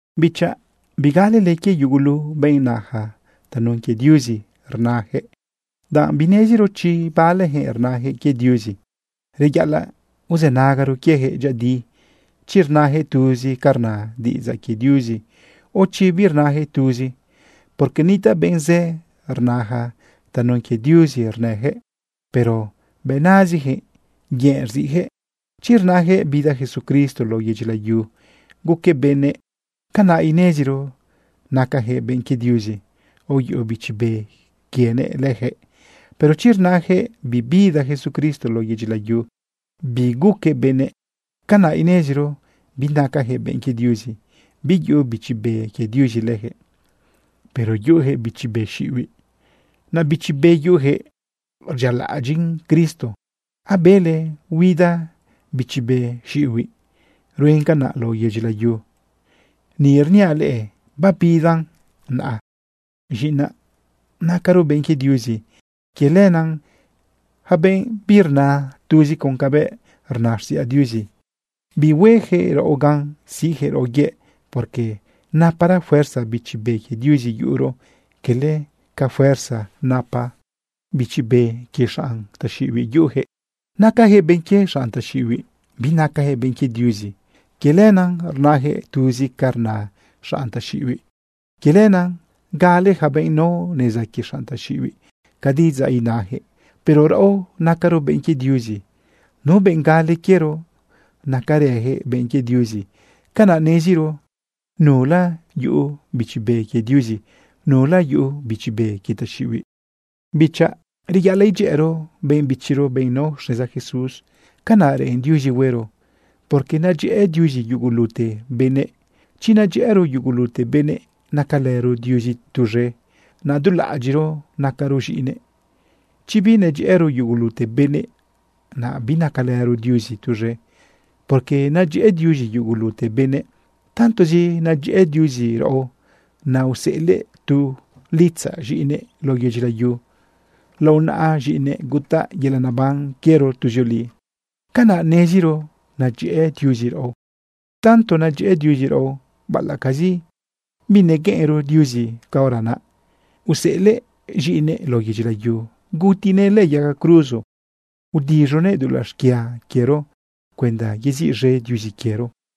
Bichaꞌ, bigalele quie yugulu benꞌ naja tanun quie Diuzi rnajëꞌ, danꞌ bineziro chi balejëꞌ rnajëꞌ quie Diuzi. Reyaꞌalaꞌ uzënagaro quiejëꞌ dyëꞌëdi chi rnajëꞌ tuzi ca rna diꞌidzaꞌ quie Diuzi, o chi birnajëꞌ tuzi. Porque nitaꞌ benꞌ zë rnaja tanun quie Diuzi rnajëꞌ, pero bëꞌ nazijëꞌ, yëꞌ rziꞌjëꞌ. Chi rnajëꞌ bida Jesucristo lao yedyi layu guquëꞌ benëꞌ, canaꞌ ineziro nacajëꞌ benꞌ quie Diuzi, aoyuꞌu Bichi Be quienëꞌ lëjëꞌ. Pero chi rnajëꞌ bibida Jesucristo lao yedyi layu, biguquëꞌ benëꞌ, canaꞌ ineziro binacajëꞌ benꞌ quie Diuzi, biyuꞌu Bichi Be quie Diuzi lëjëꞌ, pero yuꞌujëꞌ bichi be xiꞌibiꞌ. Naꞌ bichi be yuꞌujëꞌ rdyialaꞌadyiꞌn Cristo. Abele huida bichi be xiꞌibiꞌ rue canaꞌ lao yedyi layu. Ni rniaꞌ leꞌe babidan naꞌa. Z̃iꞌinaꞌ, nacaro benꞌ quie Diuzi. Quie lenaꞌ yaca benꞌ birna tuzi con cabëꞌ rna xtiꞌidzaꞌ Diuzi, bihuejëꞌ raꞌo gan siꞌjëꞌ raꞌo yëꞌ, porque napara fuerza Bichi Be quie Diuzi yuꞌuro, quele ca fuerza napa bichi be quie xanꞌ taxiꞌibiꞌ yuꞌujëꞌ. Nacajëꞌ benꞌ quie xanꞌ taxiꞌibiꞌ, binacajëꞌ benꞌ quie Diuzi. Quie lenaꞌ rnajëꞌ tuzi ca rna xanꞌ taxiꞌibiꞌ. Quie lenaꞌ gale yaca benꞌ nao neza quie xanꞌ taxiꞌibiꞌ ca diꞌidzaꞌ inajëꞌ. Pero raꞌo, nacaro benꞌ quie Diuzi. Nu benꞌ gale quiero, nacarëjëꞌ benꞌ quie Diuzi. Canaꞌ neziro nula yuꞌu Bichi Be quie Diuzi, nula yuꞌu bichi be quie taxiꞌibiꞌ. Bichaꞌ, reyaꞌalaꞌ idyëꞌëro benꞌ bichiro, benꞌ nao xneza Jesús. Canaꞌ reꞌen Diuzi huero, porque nadyëꞌë Diuzi yugulute benëꞌ. Chi nadyëꞌëro yugulute benëꞌ, nacalëro Diuzi tuz̃e, naꞌ du laꞌadyiꞌro nacaro z̃iꞌinëꞌ. Chi binadyëꞌëro yugulute benëꞌ, naꞌ binacalëro Diuzi tuz̃e, porque nadyëꞌë Diuzi yugulute benëꞌ. Tantozi nadyëꞌë Diuzi raꞌo, naꞌ useꞌelëꞌ tu litzaꞌ z̃iꞌinëꞌ lao yedyi layu. Lao naꞌa z̃iꞌinëꞌ gutaꞌ yelaꞌ naban quiero tuzioli. Canaꞌ neziro nadyëꞌë Diuzi raꞌo. Tanto nadyëꞌë Diuzi raꞌo, baꞌalaꞌcazi binegueꞌenro Diuzi caora naꞌ, useꞌelëꞌ z̃iꞌinëꞌ lao yedyi layu gutinëꞌ lëꞌë yaga cruzo, udiz̃uguëꞌ dulaꞌ xquia quiero cuenda yeziꞌz̃e Diuzi quiero.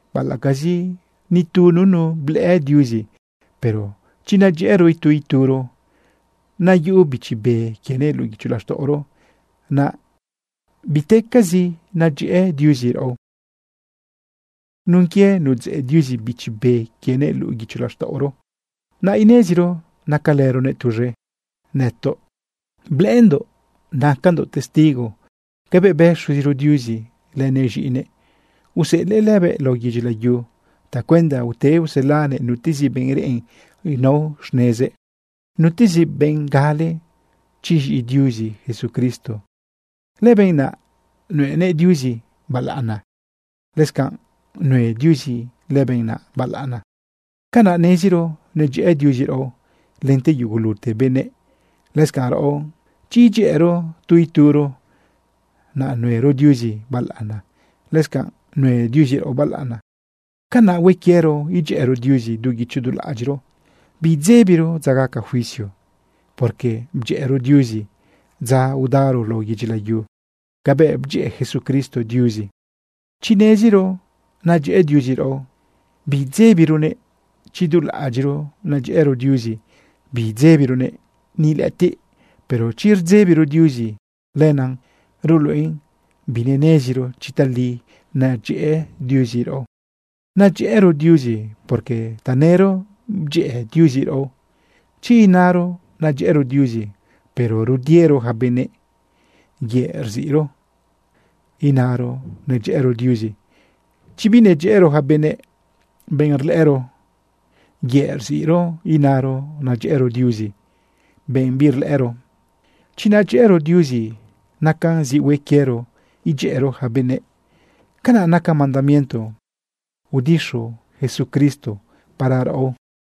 Baꞌalaꞌcazi ni tu nunu blëꞌë Diuzi, pero chi nadyëꞌëro itu ituro, naꞌ yuꞌu Bichi Be quienëꞌ luꞌu guicho laxtaꞌoro, naꞌ bitecazi nadyëꞌë Diuzi raꞌo. Nun quie nudzeꞌ Diuzi Bichi Be quienëꞌ luꞌu guicho laxtaꞌoro, naꞌ ineziro nacalëronëꞌ tuz̃e. Nëtoꞌ blëꞌëndoꞌ nacandoꞌ testigo cabëꞌ bë Xuziro Diuzi lënëꞌ z̃iꞌinëꞌ. Useꞌelëꞌ lëbëꞌ lao yedyi layu tacuenda ute uselanëꞌ nutezi benꞌ reꞌen nao xnezëꞌ. Nutezi benꞌ gale chi z̃iꞌi Diuzi Jesucristo, lëbenꞌ naꞌ nuenëꞌ Diuzi balaꞌana, lëscanꞌ nue Diuzi lëbenꞌ naꞌ balaꞌana. Canaꞌ neziro nadyëꞌë Diuzi raꞌo lente yugulute benëꞌ. Lëscanꞌ, raꞌo, chi edyëꞌëro tu ituro, naꞌ nuero Diuzi balaꞌana, lëscanꞌ nue Diuzi raꞌo balaꞌana. Canaꞌ hue quiero idyëꞌëro Diuzi du guicho du laꞌadyiꞌro, biidzebiro dza gaca juicio, porque bdyëꞌëro Diuzi dza udaro lao yedyi layu cabëꞌ bdyëꞌë Jesucristo Diuzi. Chi neziro nadyëꞌe Diuzi raꞌo, biidzebironëꞌ. Chi du laꞌadyiꞌro nadyëꞌëro Diuzi biidzëbironëꞌ ni lëꞌëtiꞌ. Pero chi rdzebiro Diuzi, lenaꞌ ruluꞌen bineneziro chi tali nadyëꞌë Diuzi raꞌo. Nadyëꞌëro Diuzi porque tanëro bdyëꞌë Diuzi raꞌo. Chi inaro nadyëꞌëro Diuzi, pero rudiero yaca benëꞌ, yëꞌ rziꞌro inaro nadyeꞌëro Diuzi. Chi binadyëꞌëro yaca benëꞌ, benꞌ rlëꞌëro, yëꞌ rziꞌro inaro nadyëꞌëro Diuzi, benꞌ birlëꞌëro. Chi nadyëꞌëro Diuzi, nacan zi hue quiero idyëꞌëro yaca benëꞌ. Canaꞌ naca mandamiento udixu Jesucristo para raꞌo.